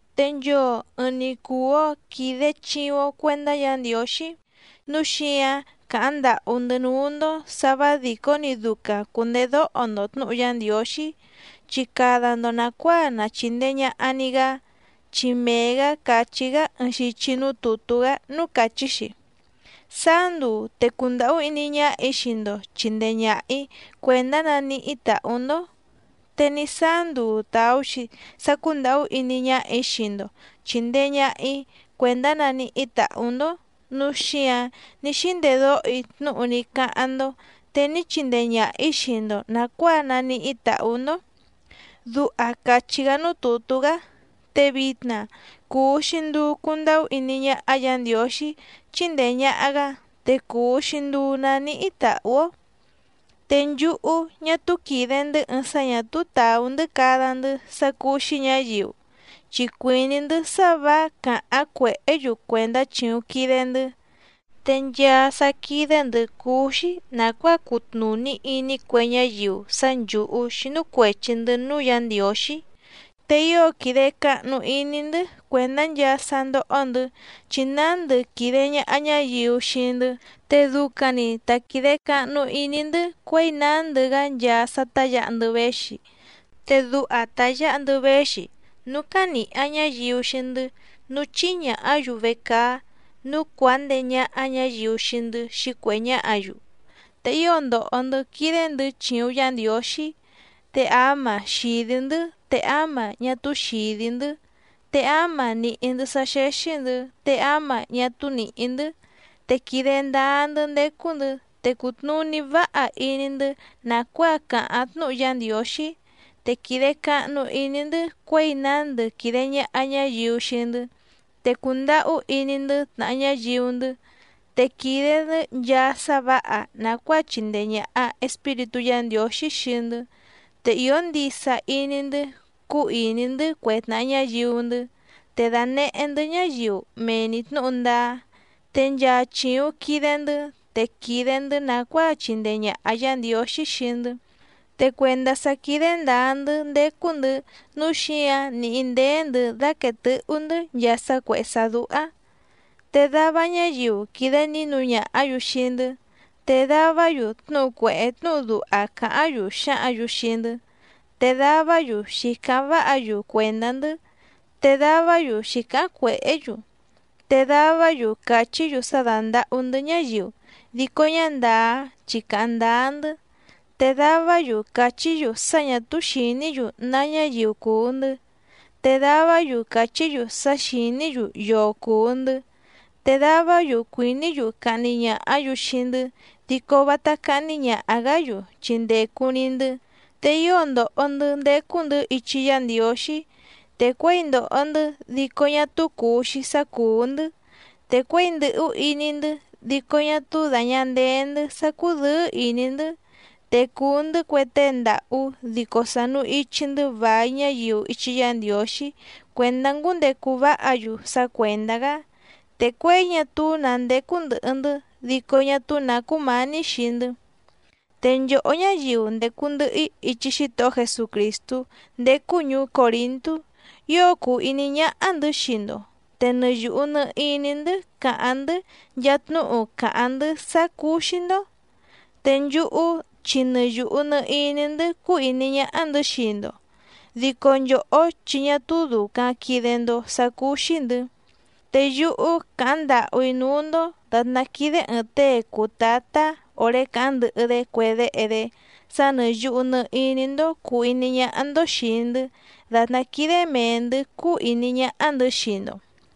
Te nchoo ɨɨⁿ‑ni cùu‑o quide chiuⁿ‑o cuendá Yǎ Ndiǒxí nǔu xíǎⁿ càháⁿ ndàhú‑ndɨ́ núú‑ndó sǎ vǎ dìcó‑ni ducaⁿ cùndedóho‑ndo tnǔhu Yá Ndiǒxí, chi cada‑ndo nàcuáa na chìndee ñaha‑ni‑gá. Chi mee‑gǎ càchí‑gá ɨɨⁿ xichi núú tùtú‑gá núú càchí‑xi: Sáá nduu te cundàhú iní ñáhà‑í xii‑ndo chìndee ñaha‑í cuèndá naníhí tàhú‑ndó, te ní sáá nduu tàú‑xi sá cúndàhú iní ñáhà‑í xii‑ndo chìndee ñaha‑í cuèndá naníhí tàhú‑ndó, núu xíǎⁿ ní xíndedóho‑í tnúhu ní cáháⁿ‑ndó te ní chindee ñàha‑í xii‑ndo nàcuáa naníhí tàhú‑ndó. Duha càchí‑gá núú tùtú‑gá. Te vitna cùu‑xi nduu cundahú iní ñáhá Yǎ Ndiǒxí chíndèe ñaha‑gá, te cùu‑xi nduu naníhí tàhú‑ó. Te nchúhú ñá túú quìde‑ndɨ́ ɨɨⁿ sá ñà túú tàú‑ndɨ́ cada‑ndɨ́ sá cúú‑xí ñǎyiu, chi cuìní‑ndɨ́ sá vǎ càháⁿ cuèhé‑yu cuèndá chìuⁿ quide‑ndɨ́. Te nchaa sá quídé‑ndɨ̌ cúú‑xí nàcuáa cutnùní iní cue ñáyiu sá nchǔhú xínú cuèchi‑ndɨ́ núú Yǎ Ndiǒxí, te ío quìde cahnu iní‑ndɨ́ cuèndá nchaa sá ndóhó‑ndɨ̌, chi nándɨ quìde ñaha ñáyiu xii‑ndɨ́, te ducaⁿ‑ni ta quìde cahnu iní‑ndɨ́ cuěi nándɨ‑gá nchaa sá tá yǎha‑ndɨ́ véxi. Te duha ta yǎha‑ndɨ́ véxi, núú cánìha ñáyiu xii‑ndɨ́, núú chíhí ñàhá‑yu vecaá, núú cuàá ndeé ñáhá ñǎyiu xii‑ndɨ́ xǐcuèhé ñáhǎ‑yu, te ío ndòho‑ndɨ́ quídé‑ndɨ̌ chìuⁿ Yá Ndiǒxí, te áma xìdí‑ndɨ́ te áma ñá túú xìdí‑ndɨ́, te áma nìhí‑ndɨ́ sá xéxí‑ndɨ̌ te áma ñá túú nìhí‑ndɨ́. Te quìde ndáá‑ndɨ́ ndécú‑ndɨ̌, te cùtnuní váha iní‑ndɨ́ nàcuáa càháⁿ tnúhu Yá Ndiǒxí, te quìde cahnu iní‑ndɨ́ cuěi nándɨ quìde ñaha ñáyiu xii‑ndɨ́, te cùndahú iní‑ndɨ́ tnàha ñáyiu‑ndɨ́, te quìde‑ndɨ́ nchaa sá vǎha nàcuáa chìndee ñaha Espíritú Yǎ Ndiǒxí xii‑ndɨ́, te ìó ndisa iní‑ndɨ́ cúú ìní‑ndɨ́ cue tnàha ñáyiu‑ndɨ́. Te dànehé‑ndɨ́ ñáyiu mee‑ni tnǔhu ndáá, te nchaa chìuⁿ quide‑ndɨ́ te quìde‑ndɨ́ nàcuáa chìndee ñaha Yá Ndiǒxí xii‑ndɨ́, te cuèndá sá quídé ndǎá‑ndɨ́ ndécú‑ndɨ̌ nǔu xíǎⁿ nìhí ndéé‑ndɨ̌ dáquèe tɨ́hú‑ndɨ̌ nchaa sá cuèhé sá dúhá. Te dava ñáyiu quìde nínu ñàhá‑yu xii‑ndɨ́, te davá‑yu tnúhu cuèhé tnúhu duha càháⁿ‑yu xǎhǎⁿ‑yu xii‑ndɨ́, te davá‑yu xǐcáháⁿ váha‑yu cuèndá‑ndɨ́ te davá‑yu xǐcáháⁿ cuèhé‑yu, te davá‑yu càchí‑yu sá dándàhú‑ndɨ́ ñáyiu dico ñá ndàá chi càháⁿ ndáá‑ndɨ́. Te davá‑yu càchí‑yu sá ñà túú xìní‑yu ná ñáyiu cùu‑ndɨ́, te davá‑yu càchí‑yu sá xìní‑yu yoo cùu‑ndɨ́, te davá‑yu cuìní‑yu cahni ñàhá‑yu xii‑ndɨ́ dico vátá cáhní ñàha‑gá‑yu chi ndècu‑ni‑ndɨ́. Te ío ndòho‑ndɨ́ ndécú‑ndɨ̌ ichi Yá Ndiǒxí, te cuěi ndòho‑ndɨ́ dico ñá túú cùu‑xi sá cùú‑ndɨ́. Te cuěi ndɨ̀hú iní‑ndɨ́ dico ñá túú dàña ndeé‑ndɨ́ sá cúdɨ̌ɨ́ ìní‑ndɨ́, te cùu‑ndɨ́ cue tée ndàhú dico sànu ichi‑ndɨ́ vài ñáyiu ichi Yá Ndiǒxí cuèndá ngúndecu váha‑yu sá cuèndá‑gá, te cuěi ñá túú nǎ ndécú ndɨ̀hɨ‑ndɨ́ dico ñá túú nǎ cúmǎní xii‑ndɨ́. Te nchòhó ñáyiu ndècu ndɨhɨ‑í ichi Xítohó Jesucrìstú ndécú ñùú Còrintú ío cùu iní ñáhá‑ndɨ̌ xii‑ndo, te nɨ yùhu nɨ iní‑ndɨ́ càháⁿ‑ndɨ́ nchaa tnúhu càháⁿ‑ndɨ́ sá cúú‑xí‑ndó. Te nchúhú chi nɨ yùhu nɨ iní‑ndɨ́ cúú ìní ñáhá‑ndɨ̌ xii‑ndo, dico nchòhó chi ñá túú dùcaⁿ quide‑ndo sá cúú‑xí‑ndɨ̌. Te yúhú càháⁿ ndàhú‑í núú‑ndó dàtná quídé ɨ̀ɨⁿ tée cùu tátá òré càháⁿ ndɨhɨ‑dé cue déhe‑dé sá nɨ̀ yuhu nɨ iní‑ndó cùu iní ñáhá‑ndó xìi‑ndɨ́ dàtná quídé mèe‑ndɨ́ cúú ìní ñáhá‑ndɨ̌ xii‑ndo.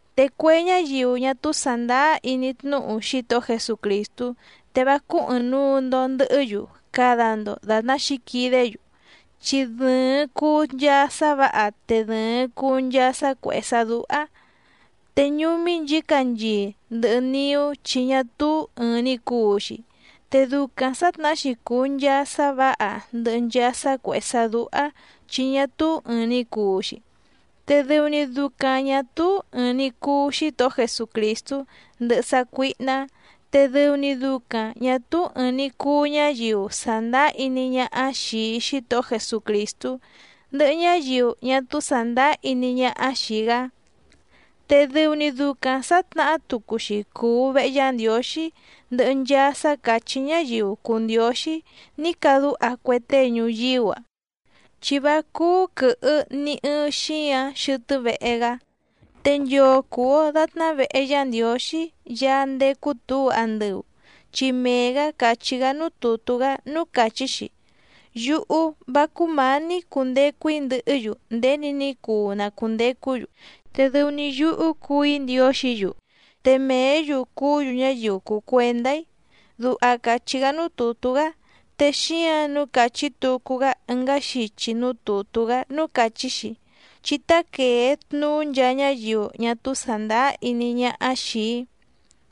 Te cue ñáyiu ñá túú sàndáá iní tnúhu Xítohó Jesucrìstú, te vá cúú ɨ̀ɨⁿnuu‑ndo ndɨhɨ́‑yu cada‑ndo dàtná xǐquidé‑yu, chi dɨ̀ɨⁿ cuu nchaa sá vǎha te dɨ̀ɨⁿ cuu nchaa sá cuèhé sá dúhá, te ñúmí nchǐcanchii ndɨhɨ niú chi ñá túú ɨ̀ɨⁿ‑ni cuu‑xi. Te ducaⁿ sǎtnahá‑xi cùu nchaa sá vǎha ndɨhɨ nchaa sá cuèhé sá dúhá chi ñá túú ɨ̀ɨⁿ‑ni cuu‑xi. Te dɨu‑ni ducaⁿ ñà túú ɨ̀ɨⁿ‑ni cuu Xítohó Jesucrìstú ndɨhɨ sácuíhná, te dɨu‑ni ducaⁿ ñǎ túú ɨ̀ɨⁿ‑ni cuu ñáyiu sàndáá iní ñáhá xìi Xítohó Jesucrìstú ndɨhɨ ñáyiu ñá túú sàndáá iní ñáhá xìi‑gá. Te dɨu‑ni ducaⁿ sǎtnahá tucu‑xi cùu vehe Yá Ndiǒxí ndɨhɨ nchaa sá càchí ñáyiu cùu ndióxí ní cadúha cue tée ñuyíú‑a, chi vá cúú quɨ̀hɨ ni ɨɨⁿ xíǎⁿ xɨtɨ́ vehe‑gá. Te nchoo cùu‑o datná vehe Yá Ndiǒxí Yaá ndécú tǔu andɨu, chi mee‑gǎ càchí‑gá núú tùtú‑gá núú càchí‑xi: Yúhú vá cúmǎní cundecu‑í ndɨhɨ́‑yu nděni ní cuu na cùndecú‑yu, te dɨu‑ni yúhú cuu‑í Ndiǒxǐ‑yu, te mèé‑yu cuú‑yu ñáyiu cùu cuendá‑í. Duha càchí‑gá núú tùtú‑gá. Te xíǎⁿ nǔu càchí tucu‑gá ɨngá xichi núú tùtú‑gá núú càchí‑xi: Chí tá quèe tnuú nchaa ñáyiu ñá túú sàndáá iní ñáhá xìi‑í,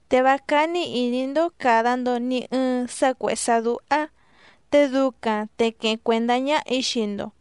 te vá cání ìní‑ndó càda‑ndo ni ɨɨⁿ sá cuèhé sá dúhá, te ducaⁿ te queheⁿ cuèndá ñáhà‑í xii‑ndo,